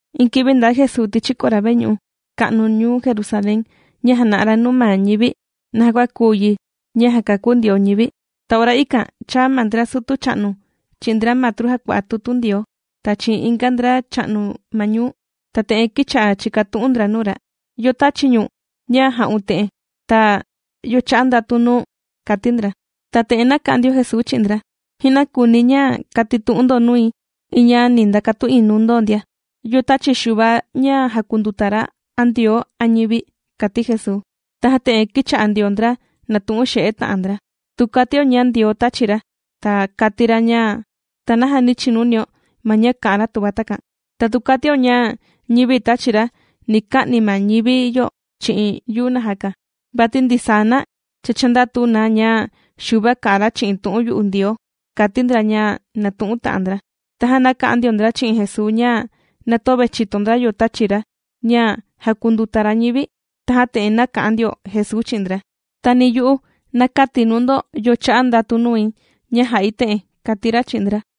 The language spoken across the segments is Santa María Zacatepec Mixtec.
Iin kivi ndaa Jesuu tichi kora veñu'u ka'nu ñuu Jerusalén ña jàna'a ra nuu ma ñivi naja kua kuu yi ña jàkakú Ndioo ñivi. Ta ora ikan chāa ma ndra sutu cha'nu chi'in ndra matru jàkua'a tutu Ndioo, ta chi'in inga ndra cha'nu ma ñuu. Ta te'en kīcha'a chìkatu'un ndra nuu ra: ―¿Yo tāchi ñu̱n ña jà'un te'en? Ta, ¿yo chā'a ndatu nuu̱n? ―kàti ndra. Ta te'en nāka'an ndio Jesuu chi'in ndra: ―Ji'na kùuni̱ ña katitu'un ndo nui iin ña ni ndakatu'in nuu ndo ndia: ¿Yo tāchi Xuva ña jàkunduta ra, a Ndioo, a ñivi? ―kàti Jesuu. Tajan te'en kīcha'a ndio ndra nàtu'un xe'e ta'an ndra: ―Tu katio ña Ndioo tāchi ra, ta kati ra ña, ¿ta naja nī chinunio ma ña kà'an ra tuva takan? Ta tu kàtio ña ñivi tāchi ra ni ka'ni ma ñivi yo chi'in yuu najaka, vati ndisaa na cha chàndatu na ña Xuva kà'an ra chi'in tu'un yu'u Ndioo ―kàti ndra ña nātu'un ta'an ndra. Tajan nāka'an ndio ndra chi'in Jesuu ña na töve chìto ndra yo tāchi ra ña jàkunduta ra ñivi. Tajan te'en nāka'an ndio Jesuu chi'in ndra: ―Ta ni yu'u na käti̱ nuu ndo yo chā'a ndatu nui ña jā'i te'en ―kàti ra chi'in ndra.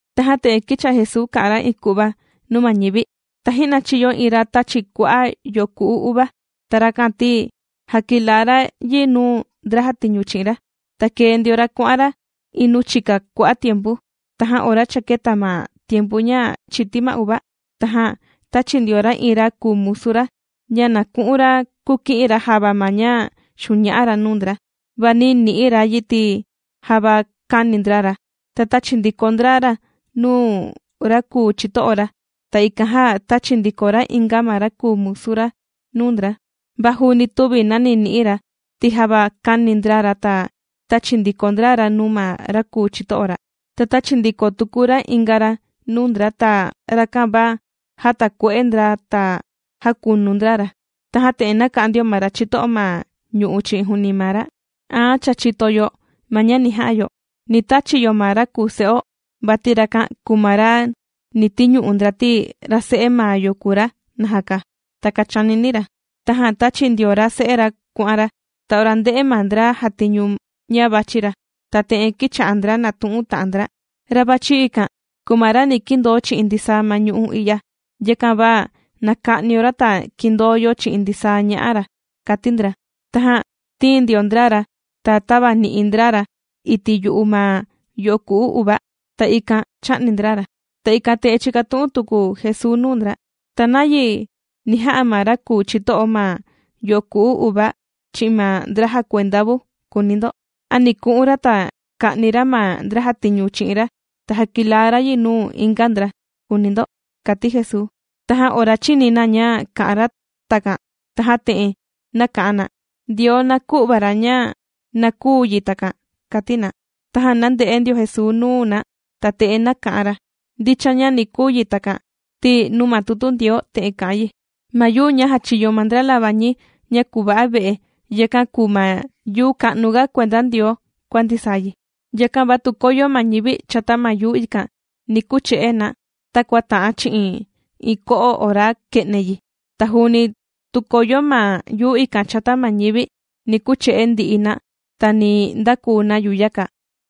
Tajan te'en kīcha'a Jesuu kà'an ra iin ku'va nuu ma ñivi: ―Taji'na chīyo iin ra tāchi kua'a' yoku'u uva. Ta rakan ti jakilaa ra yi nuu ndra jàtiñu chi'in ra. Ta kēe ndio ra kuà'an ra iin nuu chika kua'a' tiempu. Tajan ora cha kēta ma tiempu ña chìti ma uva, tajan tāchi ndio ra iin ra kùu musu ra ña na ku'un ra kuki'in ra java ma ña xuña'a ra nuu ndra. Va nī ni'i ra yi ti java kāni ndra ra, ta tāchi ndiko ndra ra nuu ma ra kùu chito'o ra. Ta ikan jan tāchi ndiko ra inga ma ra kùu musu ra nuu ndra, va juuni tüvi nani nï'iin ra, ti java kāni ndra ra, ta tāchi ndiko ndra ra nuu ma ra kùu chito'o ra. Ta tāchi ndiko tuku ra inga ra nuu ndra, ta rakan va jātakue'e ndra ta jākunu ndra ra. ’Tajan te'en nāka'an ndio ma ra chito'o ma ñu'u' chi'in juuni maa ra: “Aan cha chìto yo ma ña ni ja'a yo. Ni tachi yo ma ra kùu se'o, vati rakan kùu ma ra ni tiñu'u ndra najaka, ti ra se'e maa yo kùu ra.” Takan chānini ra. Tajan tāchi ndio ra se'e ra kuà'an ra. Ta ora ndē'e ma ndra jàtiñu ña vàchi ra, ta te'en kīcha'a ndra nàtu'un ta'an ndra: “Ra vàchi ikan kùu ma ra ni kindoo chi'in ndisaa ma ñu'u' i'ya, yakan va na ka'nio ra ta kindoo yo chi'in ndisaa ña'a ra”, kàti ndra. Tajan tīin ndio ndra ra, ta tāvani'i ndra ra iti' yu'u ma yoku'u uva. Ta ikan chā'ni ndra ra. Ta ikan te'en chīkatu'un tuku Jesuu nuu ndra: ―¿Ta nayi ni ja'a ma ra kùu chito'o ma yoku'u uva chi'in ma ndra jàkuenda vu?, kùuni ndo. ¿A ni ku'un ra ta ka'ni ra ma ndra jàtiñu chi'in ra, ta jakilaa ra yi nuu inga ndra?, kùuni ndo ―kàti Jesuu. Tajan ora chīni na ña kā'an ra takan tajan te'en nāka'an na: ―¡Ndioo na kü'va ra ña na kuu yi takan! ―kàti na. Tajan nānde'e ndio Jesuu nuu na ta te'en nāka'an ra: ―Ndicha ña ni kuu yi takan ti nuu ma tutu Ndioo te'en kà'an yi: Ma yuu ña jāchiyo ma ndra labañi ña kùva'a ve'e, yakan kùu ma yuu ka'nuga kuenda Ndioo kua ndisaa yi. Yakan va tu koyo ma ñivi chata ma yuu ikan, ni kuche'e na takua ta'an chi'in iin ko'o ora kè'ne yi. Ta juuni tu koyo ma yuu ikan chata ma ñivi, ni kuche'e ndi'i na, ta ni ndakuu na yuyaka.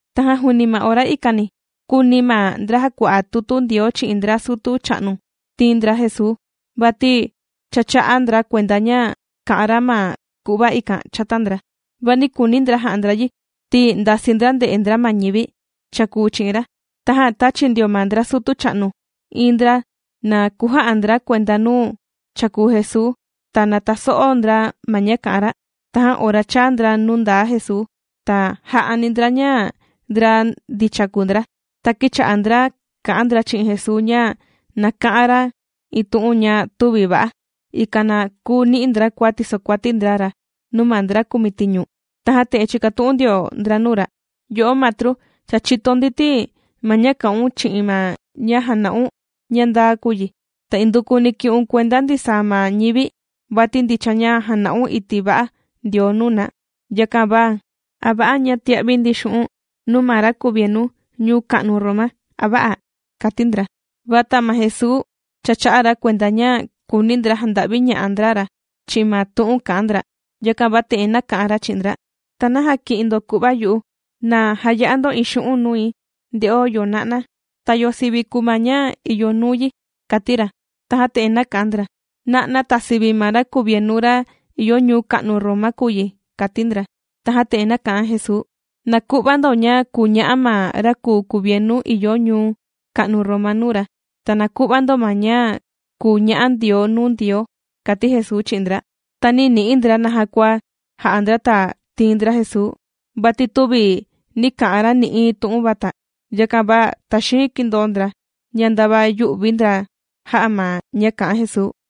Tajan juuni ma ora ikani kūuni ma ndra jàkua'a tutu Ndioo chi'in ndra sutu cha'nu tiin ndra Jesuu, vati cha chā'a ndra kuenda ña kā'an ra ma ku'va ikan chata ndra. Va nī kuuni ndra ja'a ndra yi ti ndasii ndra nde'e ndra ma ñivi chàkuu chi'in ra. Tajan tāchi ndio ma ndra sutu cha'nu iin ndra na kuja'a ndra kuenda nuu chàkuu Jesuu ta na taso'o ndra ma ña kà'an ra. Tajan ora chāa ndra nuu ndaa Jesuu, ta jā'ani ndra ña ndra ndicha kùu ndra. Ta kīcha'a ndra kà'an ndra chi'in Jesuu ña na ka'an ra iin tu'un ña tüvi va'a, ikan na kuu ni'i ndra kua tisokuati ndra ra nuu ma ndra kumitiñu. Tajan te'en chīkatu'un ndio ndra nuu ra: ―Yo'o Matru, cha chìto ndi ti ma ña kà'un chi'in ma ña jàna'un ña ndaa kùu yi, ta indukuni kì'un kuenda ndisaa ma ñivi, vati ndicha ña jàna'un iti' va'a Ndioo nuu na. Yakan va, ¿a va'a ña tia'vi ndi xu'un' nuu ma ra kuvienu ñuu ka'nu Roma, a vä'a? ―kàti ndra. Va ma Jesuu cha chā'a ra kuenda ña kùuni ndra janda'viña'a ndra ra chi'in ma tu'un kà'an ndra, yakan va te'en nāka'an ra chi'in ndra: ―¿Ta naja kì'in ndo ku'va yu'u? Na jaya'a ndo iin xu'un' nui nde'o yo na'na, ta yo sivi kùu ma ña ìyo nuu yi ―kàti ra. Tajan te'en nāka'an ndra: ―Na'na ta sivi ma ra kuvienu ra ìyo ñuu ka'nu Roma kùu yi ―kàti ndra. Tajan te'en nāka'an Jesuu: ―Na ku'va ndo ña kùu ña'a ma ra kùu kuvienu ìyo ñuu ka'nu Roma nuu ra, ta na ku'va ndo ma ña kùu ña'a Ndioo nuu Ndioo ―kàti Jesuu chi'in ndra. Ta nī ni'i ndra naja kua ja'a ndra ta tiin ndra Jesuu, vati tüvi nī ka'an ra nï'iin tu'un vata. Yakan va taxiin kīndoo ndra ña ndava yū'vi ndra jā'a ma ña kā'an Jesuu.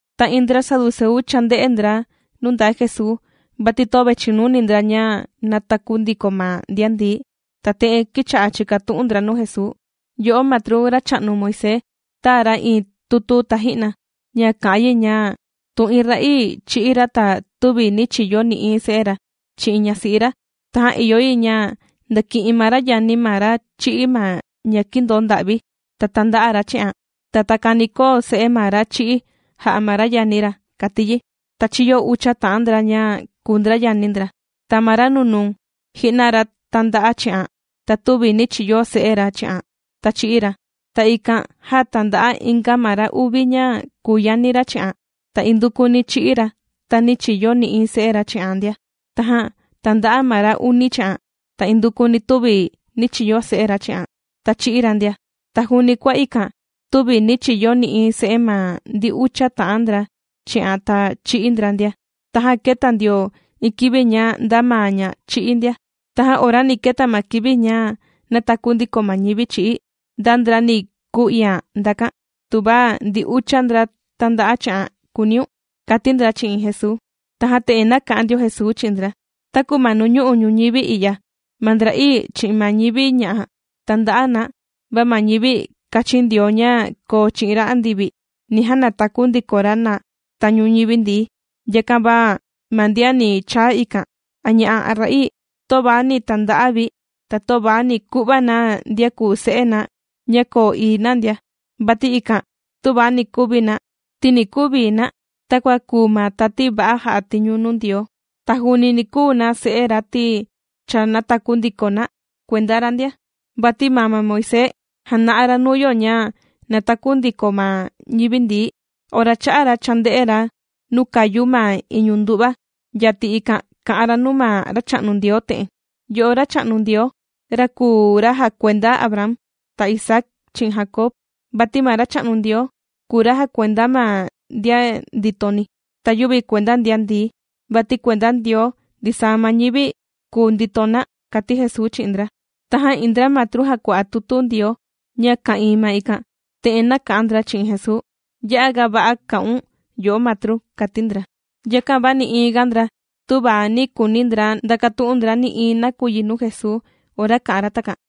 Ta iin ndra Saduceu chānde'e ndra nuu ndaa Jesuu, vati töve chìnuni ndra ña nàtaku ndiko ma ndian ndií. Ta te'en kīcha'a chìkatu'un ndra nuu Jesuu: ―Yo'o Matru, racha'nu Moisés tāa ra iin tutu taji'na ña kà'an yi ña tu iin ra'ii chī'í ra ta tüvi nī chiyo nï'iin se'e ra chi'in ñasi'i ra, tajan ìyo yi ña ndaki'in ma ra yani ma ra chī'í ma ña kìndonda'vi ta tanda'a ra chi'an. Ta takan ni koo se'e ma ra chī'í jà'a ma ra yani ra, kàti yi. Ta chīyo ucha ta'an ndra ña kùu ndra yani ndra. Ta ma ra nunuu ji'na ra tānda'a chi'an, ta tüvi nī chiyo se'e ra chi'an. Ta chī'í ra. Ta ikan jan tānda'a inga ma ra uvi ña kùu yani ra chi'an. Ta indukuni chī'í ra ta nī chiyo nï'iin se'e ra chi'an ndia. Tajan tānda'a ma ra uni chi'an, ta indukuni tüvi nī chiyo se'e ra chi'an, ta chī'í ra ndia. Ta juuni kua ikan tüvi nī chiyo nï'iin se'e ma ndi ucha ta'an ndra chi'an ta chī'í ndra ndia. Tajan kēta ndio iin kivi ña nda maa ña chī'í ndia. Tajan ora ni keta ma kivi ña nàtaku ndiko ma ñivi chī'í, ¿nda ndra ni kuu iian ndakan, tuva ndi ucha ndra tānda'a chi'an?, kùuniun ―kàti ndra chi'in Jesuu. Tajan te'en nāka'an ndio Jesuu chi'in ndra: ―Taku ma nuu ñu'u' ñuñivi i'ya ma ndra'ii chi'in ma ñivi ña'a tànda'a na, va ma ñivi kāchin Ndioo ña koo chi'in ra andivi ni janataku ndiko ra na tañu ñivi ndií. Yakan va ma ndian ni chaa ikan a ña'a' a ra'ii, töva ni tanda'a vi ta töva ni ku'va na ndian kuu se'e na ña koo ii na ndia, vati ikan tüva ni kuvi na ti ni kuu vii na takua kùu ma tati va'a jà'a tiñu nuu Ndioo. Ta juuni ni kuu na se'e ra ti cha nātaku ndiko na kuenda ra ndia. Vati maa ma Moisés jàna'a ra nuu yo ña nàtaku ndiko ma ñivi ndií. Ora chā'an ra chānde'e ra nuu kàyu ma iñu ndu'va yati ikan kā'an ra nuu ma Racha'nu Ndioo te'en: “Yo'o Racha'nu Ndioo, ra kùu ra jakuenda Abraham, ta Isaac chi'in Jacob.” Vati ma Racha'nu Ndioo kùu ra jàkuenda ma ndian nditoni, ta yüvi kuenda ndian ndií, vati kuenda Ndioo ndisaa ma ñivi kùu ndito na ―kàti Jesuu chi'in ndra. Tajan iin ndra matru jàkua'a tutu Ndioo ña ka'ìin ma ikan, te'en nāka'an ndra chi'in Jesuu: ―Ya'a ga va'a kā'un yo'o matru ―kàti ndra. Yakan va nï'iin ga ndra tüva nī kuuni ndra ndakatu'un ndra nï'iin nakuyi nuu Jesuu ora kā'an ra takan.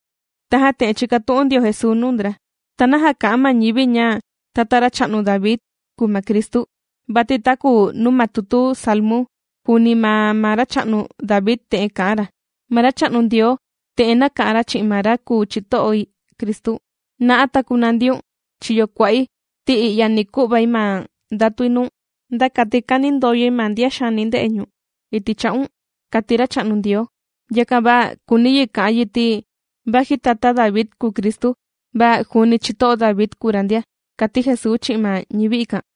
Tajan te'en chīkatu'un ndio Jesuu nuu ndra: ―¿Ta naja kà'an ma ñivi ña tata racha'nu David kùu ma Cristu? Vati taku nuu ma tutu Salmu juuni maa ma racha'nu David te'en kà'an ra: Ma Racha'nu Ndioo te'en nāka'an ra chi'in ma ra kùu chito'i Cristu: “¡Na'a ta kunandiun chiyo kua'i ti i'ya ni ku'vai ma ndatui nuu̱n, nda kati kanindoyoi ma ndian xaani nde'e ñu̱n iti' cha'un!”, kàti Racha'nu Ndioo. Yakan va kùuni yi ka'an yi, ti vaji tata David kùu Cristu, va juuni chito'o David kùu ra ndia ―kàti Jesuu chi'in ma ñivi ikan.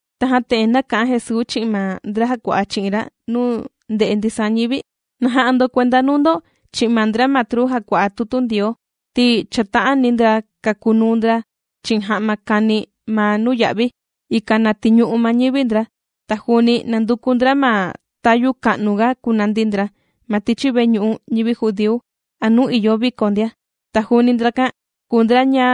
Tajan te'en nāka'an Jesuu chi'in ma ndra jàkua'a chi'in ra nuu ndè'e ndisaa ñivi: ―¡Na ja'a ndo kuenda nuu ndo chi'in ma ndra matru jàkua'a tutu Ndioo! Ti chàta'ani ndra kakunuu ndra chi'in ja'ma kani ma nuya'vi, ikan na tiñu'u ma ñivi ndra. Ta juuni nànduku ndra ma tayu ka'nuga kunandi ndra ma tichi veñu'u ñivi judíu a nuu ìyo viko ndia. Ta juuni ndrakan kùu ndra ña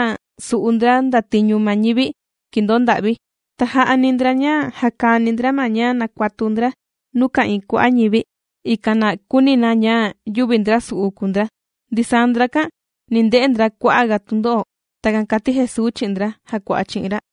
sù'u ndra ndatiñu ma ñivi kìndonda'vi, ta jà'ani ndra ña jakani ndra ma ña nàkuatu ndra nuu ka'ìin kua'a' ñivi, ikan na kuuni na ña yüvi ndrasu'u kùu ndra. Ndisaa ndrakan ni nde'e ndra kua'a' ga tundo'o. ―Takan kàti Jesuu chi'in ndra jàkua'a chi'in ra.